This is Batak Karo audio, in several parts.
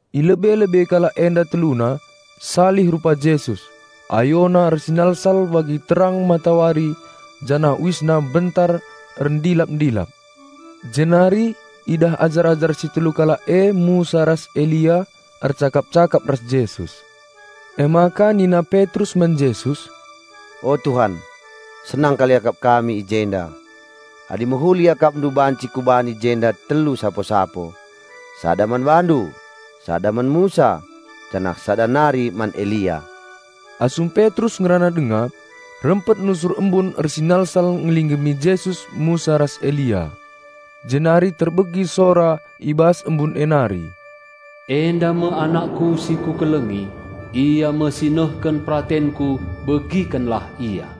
I lebe-lebe kalak enda teluna, salih rupa Jesus: AyoNa ersinalsal bagi terang matawari janah UisNa mbentar erndilap-ndilap. Jenari idah ajar-ajar si telu kalak e Musa ras Elia ercakap-cakap ras Jesus. Emaka nina Petrus man Jesus, "O Tuhan, senang kal iakap kami i jenda; adi mehuli IakapNdu banci kubahan i jenda telu sapo-sapo, sada man BaNdu, sada man Musa, janah sada nari man Elia." Asum Petrus ngerana denga, rempet nusur embun ersinalsal ngelinggemi Jesus, Musa ras Elia. Jenari terbegi sora i bas embun e nari, "Enda me AnakKu si Kukelengi, Ia me si nehken peratenKu begikenlah Ia!"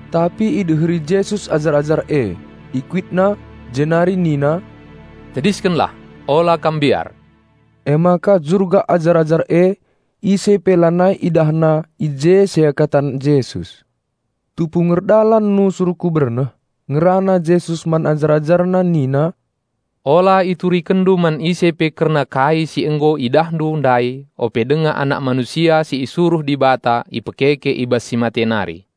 Tapi ideheri Jesus ajar-ajar e, IkuitNa, jenari nina, "Tediskenlah! Ola kam mbiar!" Emaka jurgak ajar-ajar e ise pe lanai idahna i je selain Jesus. Tupung erdalan nusur ku berneh, ngerana Jesus man ajar-AjarNa nina, "Ola iturikenndu man ise pe kerna kai si nggo idahndu ndai ope denga Anak Manusia si isuruh Dibata ipekeke i bas si mate nari."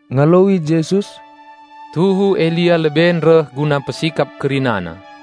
Ngaloi Jesus, "Tuhu Elia leben reh guna mpesikap kerina.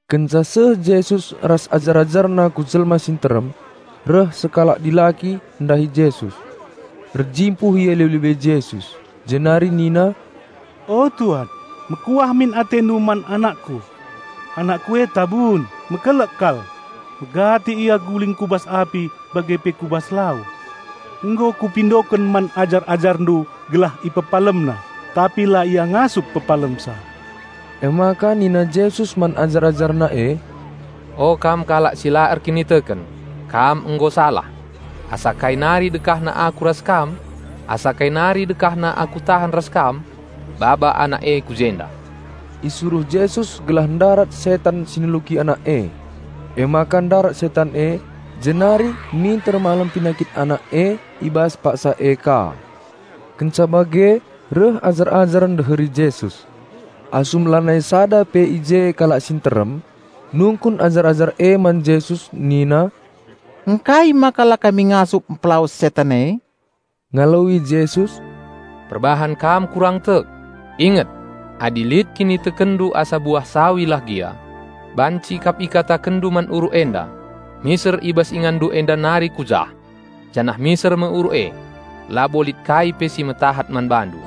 Kenca seh Jesus ras ajar-AjarNa ku jelma si nterem, reh sekalak dilaki ndahi Jesus. Erjimpuh ia i lebe-lebe Jesus jenari nina, "O Tuan, mekuah min AteNdu man anakku! Anakku e tabun mekelek kal. Megati ia njerunuk ku bas api bage pe ku bas lau. Nggo kupindoken man ajar-AjarNdu gelah ipepalemna, tapi la ia ngasup pepalemsa." Emaka nina Jesus man ajar-AjarNa e, "O kam kalak si la erkiniteken, kam nggo salah! Asakai nari dekahna Aku ras kam? Asa kai nari dekahna Aku tahan ras kam? Baba anak e ku jenda!" Isuruh Jesus gelah ndarat setan si neluki anak e. Emaka ndarat setan e, jenari minter malem penakit anak e i bas paksa e ka. Kenca bage reh ajar-ajar ndeheri Jesus. Asum la nai sada pe i je kalak si nterem, nungkun ajar-ajar e man Jesus nina, "Ngkai maka la kami ngasup mpelawes setan e?" Ngaloi Jesus, "Perbahan kam kurang tek! Inget! Adi lit kinitekenndu asa buah sawi lah gia, banci kap ikatakenndu man uruk enda, 'Miser i bas inganndu enda nari ku jah!', janah miser me uruk e. Labo lit kai pe si metahat man bandu.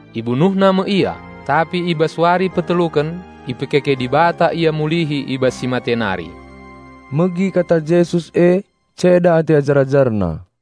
Ibunuhna me Ia, tapi i bas wari peteluken ipegeluh Dibata Ia mulihi i bas si mate nari." Megi kata Jesus e ceda ate ajar-AjarNa.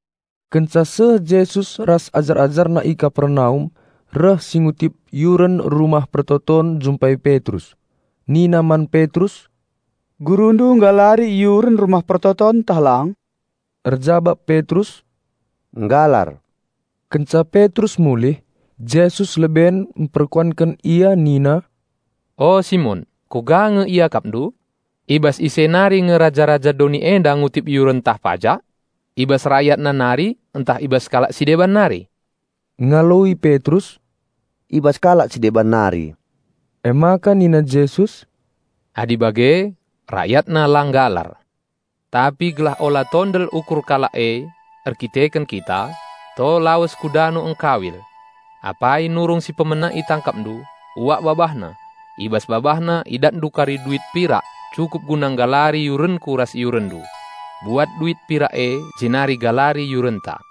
Kenca seh Jesus ras ajar-AjarNa i Kapernaum reh si ngutip yuren Rumah Pertoton njumpai Petrus. Nina man Petrus, "Gurundu nggalari yuren Rumah Pertoton ntah lang?" Erjabap Petrus, "Nggalar." Kenca Petrus mulih, Jesus leben mperkuanken ia nina, "O Simon, kuga nge iakapndu? I bas ise nari nge raja-raja doni enda ngutip yuren ntah pajak? I bas rayatna nari ntah i bas kalak si deban nari?" Ngaloi Petrus, "I bas kalak si deban nari." Emaka nina Jesus, "Adi bage, rayatna la nggalar. Tapi gelah ola tondel ukur kalak e erdandanken kita, to lawes ku dano ngkawil. Apai nurung si pemena itangkapndu, uak babahna. I bas babahna idatndu kari duit pirak cukup guna nggalari yurenKu ras yurenndu. Buat duit pirak e jenari galari yurenta."